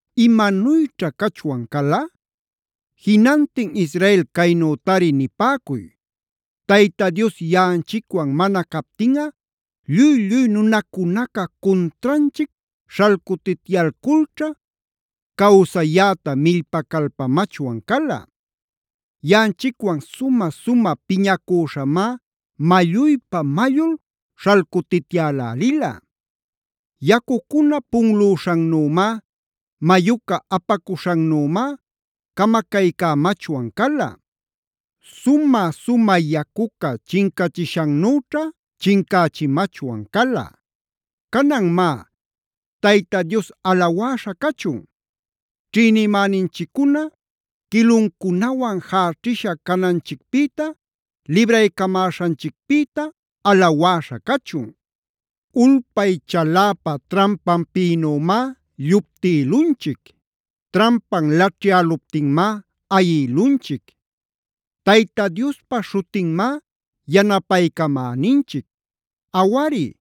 ¿imanuyćha cachwan cala? Jinantin Israel caynütari nipäcuy: Tayta Dios yaꞌanchicwan mana captinꞌa lluy-lluy nunacunaca cuntranchic śhalcutityalculćha, cawsayäta millpacalpamachwan cala. Yaꞌanchicwan sumä-sumä piñacüśhamá malluypa-mallul śhalcutityälälila. Yacucuna punlüśhannümá, mayuca apacuśhannümá camacaycämachwan cala. Sumä-sumä yacuca chincachishannüćha chincächimachwan cala. Canan má, Tayta Dios alawäśha cachun. Ćhïnimäninchiccuna quiluncunawan jäćhisha cananchicpïta libraycamäśhanchicpïta alawäśha cachun. Ulpay chaläpa trampanpïnümá lluptïlunchic. Trampan laćhyäluptinmá ayïlunchic. Tayta Diospa śhutinmá yanapaycamäninchic. Awari,